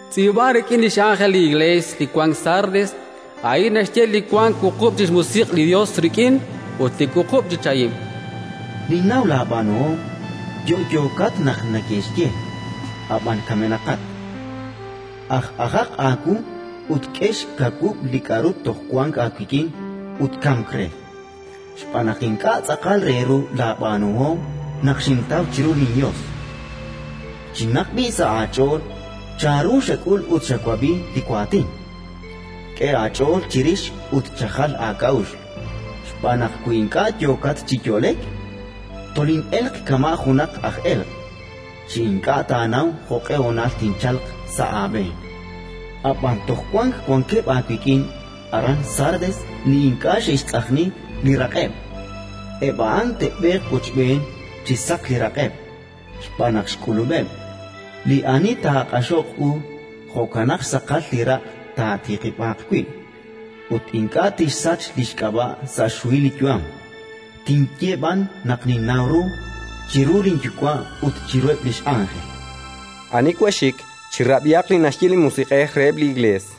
“Tz'iib'an rik'in li x'ánjel li Iklees li wank Sardes: «A'in naxye li wank wuqub' chi xmusiq' li Yos rik'in ut li wuqub' chi chahim. Ninnaw laab'aanuhom; yo'yookat naq neke'xye, ab'an kamenaqat. Aj ajaq aawu ut k'e xkawub' li k'aru toj wank aawik'in ut kamk re, xb'aan naq ink'a' tz'aqal re ru laab'aanuhom naq xintaw chiru linYos. Chinaq b'i' sa' aach'ool chanru xak'ul ut xawab'i li waatin. K'e aach'ool chirix ut chajal aak'a'uxl, xb'aan naq, wi ink'a' yooqat chi yo'lek, tolin'elq kama' junaq aj elq', chi ink'a' taanaw jo'q'e honal tinchalq sa' aab'een. Ab'an toj wank wankeb' aawik'in aran Sardes li ink'a' xe'xtz'ajni li raq'eb'; eb' a'an te'b'eeq wochb'een chi saq li raq'eb', xb'aan naq xk'ulub'eb'. Li ani taaq'axoq u, jo'kanaq xsaqal li raq' taatiqib'aaq wi', ut ink'a' tinsach li xk'ab'a' sa' xhuhil li yu'am, tinye b'an naq ninnaw ru, chiru linYuwa' ut chiruheb' li x'ánjel. Ani wank xxik, chirab'ihaq li naxye li Musiq'ej reheb' li Iklees».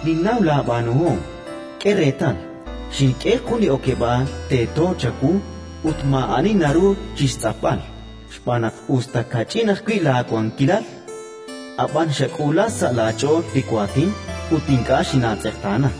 Ninnaw laab'aanuhom. K'e reetal, xink'e jun li okeb'aal teeto chawu ut maa'ani naru chi xtz'apb'al; xb'aan naq, us ta kach'in ajwi' laakawilal, ab'an xak'uula sa' laach'ool li waatin ut ink'a' xinaatz'eqtaana.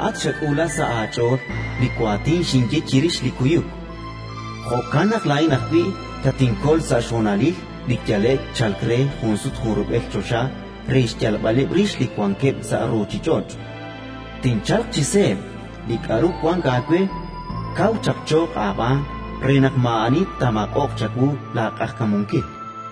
Laa'at xak'uula sa' aach'ool li waatin xinye chirix li kuyuk, jo'kan naq laa'in ajwi' tatinkol sa' xhonalil li yale'k chalk re junsut junrub'el choxa re xyalb'aleb' rix li wankeb' sa' ruuchich'och'. Tinchalq chi seeb'. Li k'aru wank aawe, kaw chapchooq aab'aan re naq maa'ani taamaq'oq chawu laaq'ajkamunkil.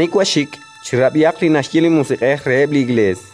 Ani wank xxik, chirab'ihaq li naxye li Musiq'ej reheb' li Iklees».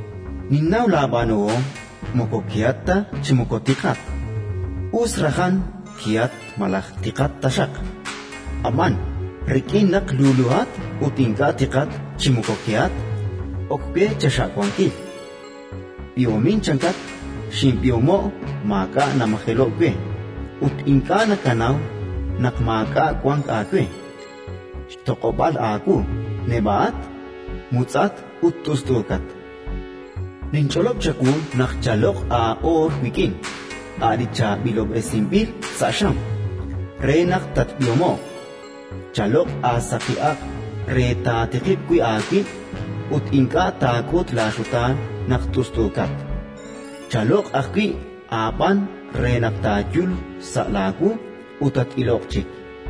Ninnaw laab'aanuhom; moko kehat ta chi moko tiqat. Us rajan kehat ta malaj tiqat taxaq! Ab'an, rik'in naq luluhat, ut ink'a' tiqat chi moko kehat, ok we chaxa'wankil. B'ihomin -chankat- xinb'ihomo'k, maak'a' namajelo'k we. Ut ink'a' nakanaw naq maak'a' wank aawe, xtoq'ob'aal aawu, neb'a'at, mutz'at ut t'ust'uukat. Ninch'olob' chawu naq chaloq' aa'oor wik'in, a' li chaab'ilob'resinb'il sa' xam, re naq tatb'ihomo'q. Chaloq' aasaqi aq' re taatiqib' wi' aawib' ut ink'a' taak'ut laaxutaan naq t'ust'uukat. Chaloq' ajwi' aab'aan re naq taayul xsa' laawu ut tat-iloq chik.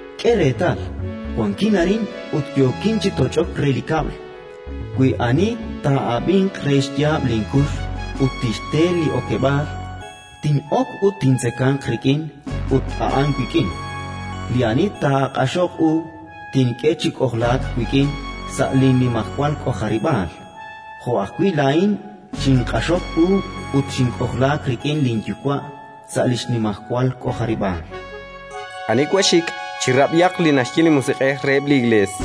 «K'e reetal, wankin arin ut yookin chi toch'ok re li kab'l: wi ani taa'ab'inq re xyaab' linkux ut tixte li okeb'aal, tin'ok ut tintzekanq rik'in ut a'an wik'in. «Li ani taaq'axoq u, tink'e chi k'ojlaak wik'in sa' linnimajwal k'ojarib'aal, jo' ajwi' laa'in xinq'axok u ut xink'ojlaak rik'in linYuwa' sa' li xnimajwal k'ojarib'aal. «Ani wank xxik, chirab'ihaq li naxye li Musiq'ej reheb' li Iklees»”.